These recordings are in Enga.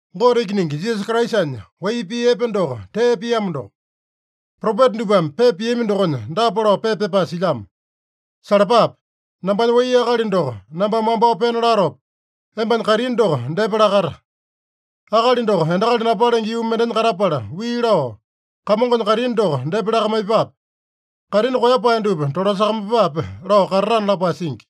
Gote Ikiningi Jisasa Kraisanya wai pii epe doko tee piamo doko. Propeta dupame pepa piami dokonya dapa lao pepa pyapae silyamo: “Salapape! Nambanya wai akali doko nambame wambao pena latopa, embanya kaitini doko depa lakata. Akali doko endakali napalenge yuu mendenya katapala wii lao, ‘Kamongonya kaitini doko depa lakamaiyepape. Kaitini koeyapae dupa tolasakamaiyepape’ lao katatana” lapae singi.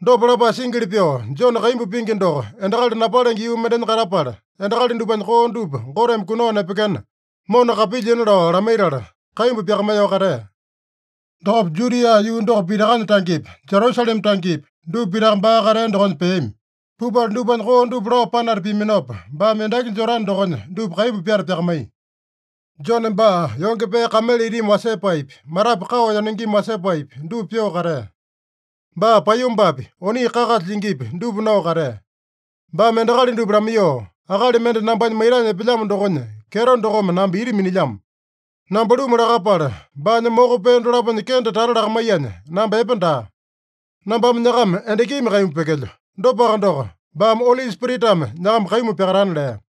Dopa lapae singili pyoo, Jone kaimbu pingi doko endakali napalenge yuu mendenya katapala, endakali dupanya koo dupa Goteme kunao nepekena, mona kapilyina lao lamaitala, kaimbu pyakamaiyoo katea. Dokopa Judia yuu doko pitakanya tangepi, Jerusalema tangepi, dupa pitaka baa katea dokonya peami. Pupala dupanya koo dupa lao panata piaminopa, baame endaki Jodane dokonya dupa kaimbu pyata pyakamaiya. Jone baa yonge pee kamele itimi wasepaepi, matapu kao yanungimi wasepaepi, dupa pyoo katea. Baa paiyombapi, oni kakasa lyingipi, dupa nao katea. Baame endakali dupa lamaiyoo, “Akali mende nambanya maitanya epelyamo dokonya kyeto dokome namba ita minilyamo. Namba luma lakapala, baanya moko pee dolaponya kende tata lakamaiyanya, namba epe daa. Nambame nyakama endakimi kaimbu pyekelyo. Dopaka doko, baame Oli Spiritame nyakama kaimbu pyakatana” lea.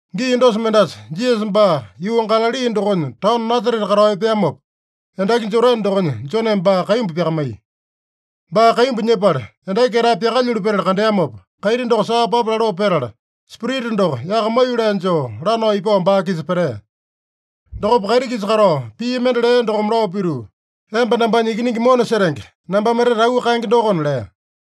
Gii dosa mendasa, Jisasa baa yuu Galali dokonya taono Nasarete katao epeamopa, endaki Jodane dokonya Joneme baa kaimbu pyakamaiya. Baa kaimbu nyepala, endaki ketae pyakalyulu petala kandeamopa, kaiti doko saa papa laloo petala, Spirita doko yaka maiyolee joo lanao ipao baa-kisa petea. Dokopa kaiti-kisa katao pii mende lea dokome lao pituu, “Emba nambanya Ikiningi mona setenge, nambame etete auu kaenge dokona” lea.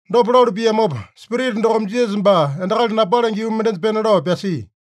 Dopa lalu piamopa, Spirita dokome Jisasa baa endakali napalenge yuu mendenya pena lao pyasia.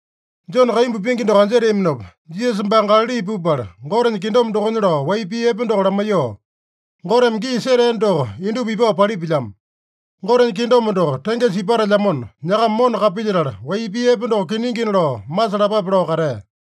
Jone kaimbu pingi doko anjeteaminopa, Jisasa baa Galali pupala, Gotenya kingdom dokonya lao wai pii epe doko lamaiyoo, “Goteme gii setea doko indupa ipao palipilyamo. Gotenya kingdom doko tengesa ipatelyamona, nyakama mona kapilyetala, wai pii epe doko kiningina lao masalapape” lao katea.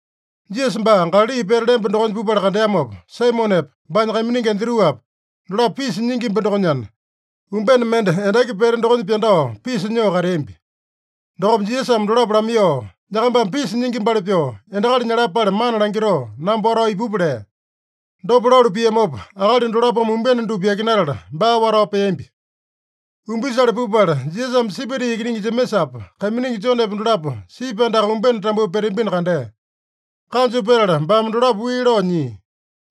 Jisasa baa Galali pete lemba dokonya pupala kandeamopa, Saimonepa, baanya kaiminingi Andruapa, dolapo pisa nyingimba dokonyana, umbene mende endaki pete dokonya pyandao pisa nyoo kateambi. Dokopa Jisasame dolapo lamaiyoo, “Nyakambame pisa nyingimbali pyoo, endakali nyalapale mana langitoo, namba watao ipupa” lea. Dopa lalu piamopa, akali dolapome umbene dupa yakinatala, baa watao peambi. Umbisale pupala, Jisasame Sebedi ikiningi Jemesapa, kaiminingi Jonepa dolapo sipi andaka umbene tambuu peteambino kandea. Kanju petala baame dolapo wii lao nyia.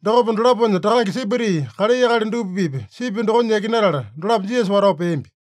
Dokopa dolaponya takange Sebedi kalai akali dupa-pipa sipi dokonya yakinatala, dolapo Jisasa watao peambi.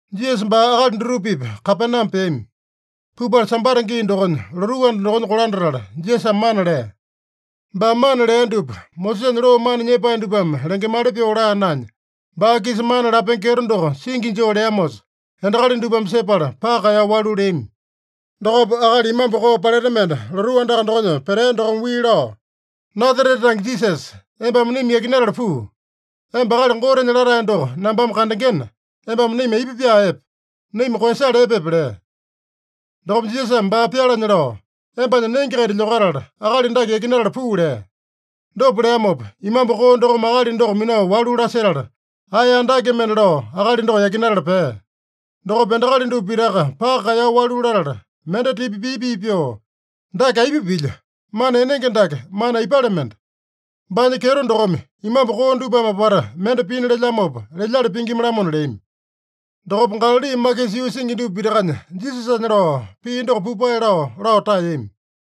Jisasa baa akali dutupa-pipa Kapename peami. Pupala Sambata gii dokonya lotuu anda dokonya kolandatala, Jisasame mana lea. Baame mana lea dupa, Mosesanya loo mana nyepae dupame lengemali pyoo laa naenya, baa-kisa mana lapenge kyeto doko singi joo leamosa, endakali dupame sepala paka kaeyao walu leami. Dokopa akali imambu koo paleta mende lotuu andaka dokonya petea dokome wii lao, “Nasarete tange Jisasa, embame naima yakinatala puu. Emba Akali Gotenya Latae doko nambame kandengena, embame naima aipa pyaa epe? Naima koeyasala epepe?” lea. Dokopa Jisasame baa pyalanya lao, “Embanya nenge-kaita lyokatala, akali dake yakinatala puu” lea. Dopa leamopa, imambu koo dokome akali doko minao walu lasetala, ae andake mende lao akali doko yakinatala pea. Dokopa endakali dupa pitaka paka kaeyao walu latala, mende tipa pii-pii pyoo, “Dake aipa pilya? Mana enenge dake mana aipale mende? Baanya kyeto dokome, imambu koo dupame apata mende pina lelyamopa, lelyali pingima-lamona” leami. Dokopa Galali makisa yuu singi dupa pitakanya Jisasanya lao pii doko pupae lao, lao taeyami.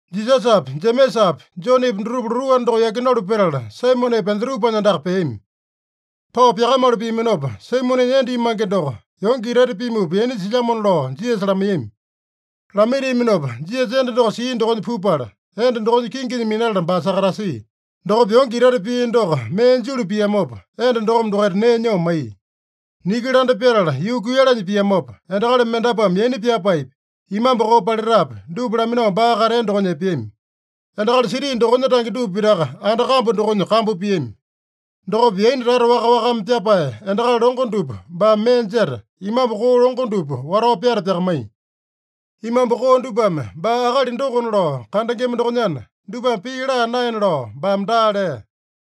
Jisasapi, Jemesapi, Jonepi dutupa lotuu anda doko yakinalu petala, Saimonepa, Andruapanya andaka peami. Pao pyakamalu piaminopa, Saimonenya enda imange doko yonge itaita pimupa yaina silyamona lao Jisasa lamaiyami. Lamaitiaminopa, Jisasa enda doko sia dokonya pupala, enda dokonya kinginya minatala baa sakatasia. Dokopa yonge itaita pia doko mee julu piamopa, enda dokome dokaita nee nyoo maiya. Niki landa pyatala yuu kuiyalanya piamopa, endakali mendapuame yaina pyapaepi, imambu koo paletapi, dupa laminao baa katea dokonya epeami. Endakali siti dokonya tange dupa pitaka anda kambu dokonya kambu piami. Dokopa yaina tata waka-wakame pyapae endakali longo dupa baame mee jeta, imambu koo longo dupa watao pyata pyakamaiya. Imambu koo dupame baa akali dokona lao kandengema dokonyana, dupame pii laa naena lao baame daa lea.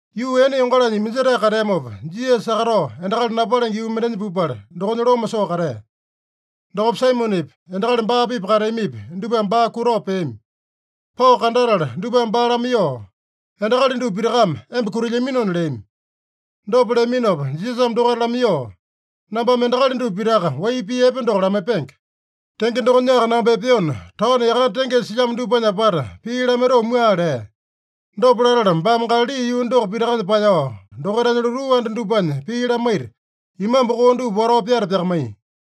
Yuu ene yongalanya iminjetae kateamopa, Jisasa sakatao endakali napalenge yuu mendenya pupala, dokonya loma soo katea. Dokopa Saimonepi, endakali baa-pipa kateamipi, dupame baa kutao peami. Pao kandatala dupame baa lamaiyoo, “Endakali dupa pitakame emba kutilyaminona” leami. Dopa leaminopa Jisasame dokaita lamaiyoo, “Nambame endakali dupa pitaka wai pii epe doko lamaipenge. Tenge dokonyaka namba epeona, taono yakane tengesa silyamo dupanya apata pii lamaitoo mua” lea. Dopa latala baame Galali yuu doko pitakanya paeyao, dokaitanya lotuu anda dupanya pii lamaita, imambu koo dupa watao pyata pyakamaiya.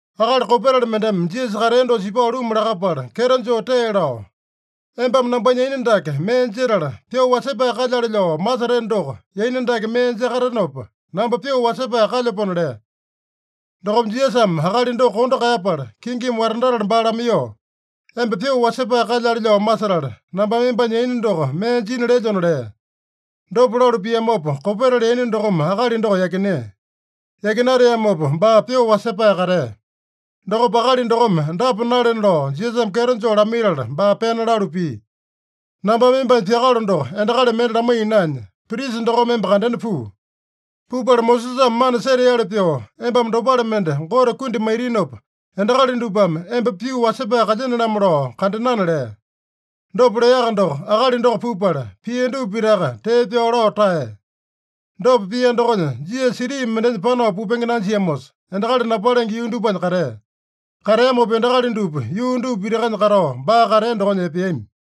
Akali kopetali mendeme Jisasa katea dosa ipao luma lakapala, kyeto joo tee lao, “Embame nambanya yaina dake mee jetala, pyoo wasepae kalyale lao maseteno doko, yaina dake mee jakatenopa, namba pyoo wasepae kalyapona” lea. Dokopa Jisasame akali doko kondo kaeyapala, kingimi watandatala baa lamaiyoo, “Emba pyoo wasepae kalyale lao masetala, nambame embanya yaina doko mee jina lelyona” lea. Dopa lalu piamopa, kopetali yaina dokome akali doko yakinea. Yakinateamopa baa pyoo wasepae katea. Dokopa akali dokome dapa nalena lao Jisasame kyeto joo lamaitala baa pena lalu pia: “Nambame embanya pyakalo doko endakali mende lamaiya naenya, prisa dokome emba kandena puu. Pupala Mosesame mana seteali pyoo embame dopale mende Gote kundi maitinopa, endakali dupame emba pyoo wasepae kalyene-lamo lao kandenana” lea. Dopa leaka doko akali doko pupala, pia dupa pitaka tee pyao lao taeya. Dopa pia dokonya, Jisasa siti mendenya panao pupenge nanjiamosa, endakali napalenge yuu dupanya katea. Kateamopa, endakali dupa yuu dupa pitakanya katao baa katea dokonya epeami.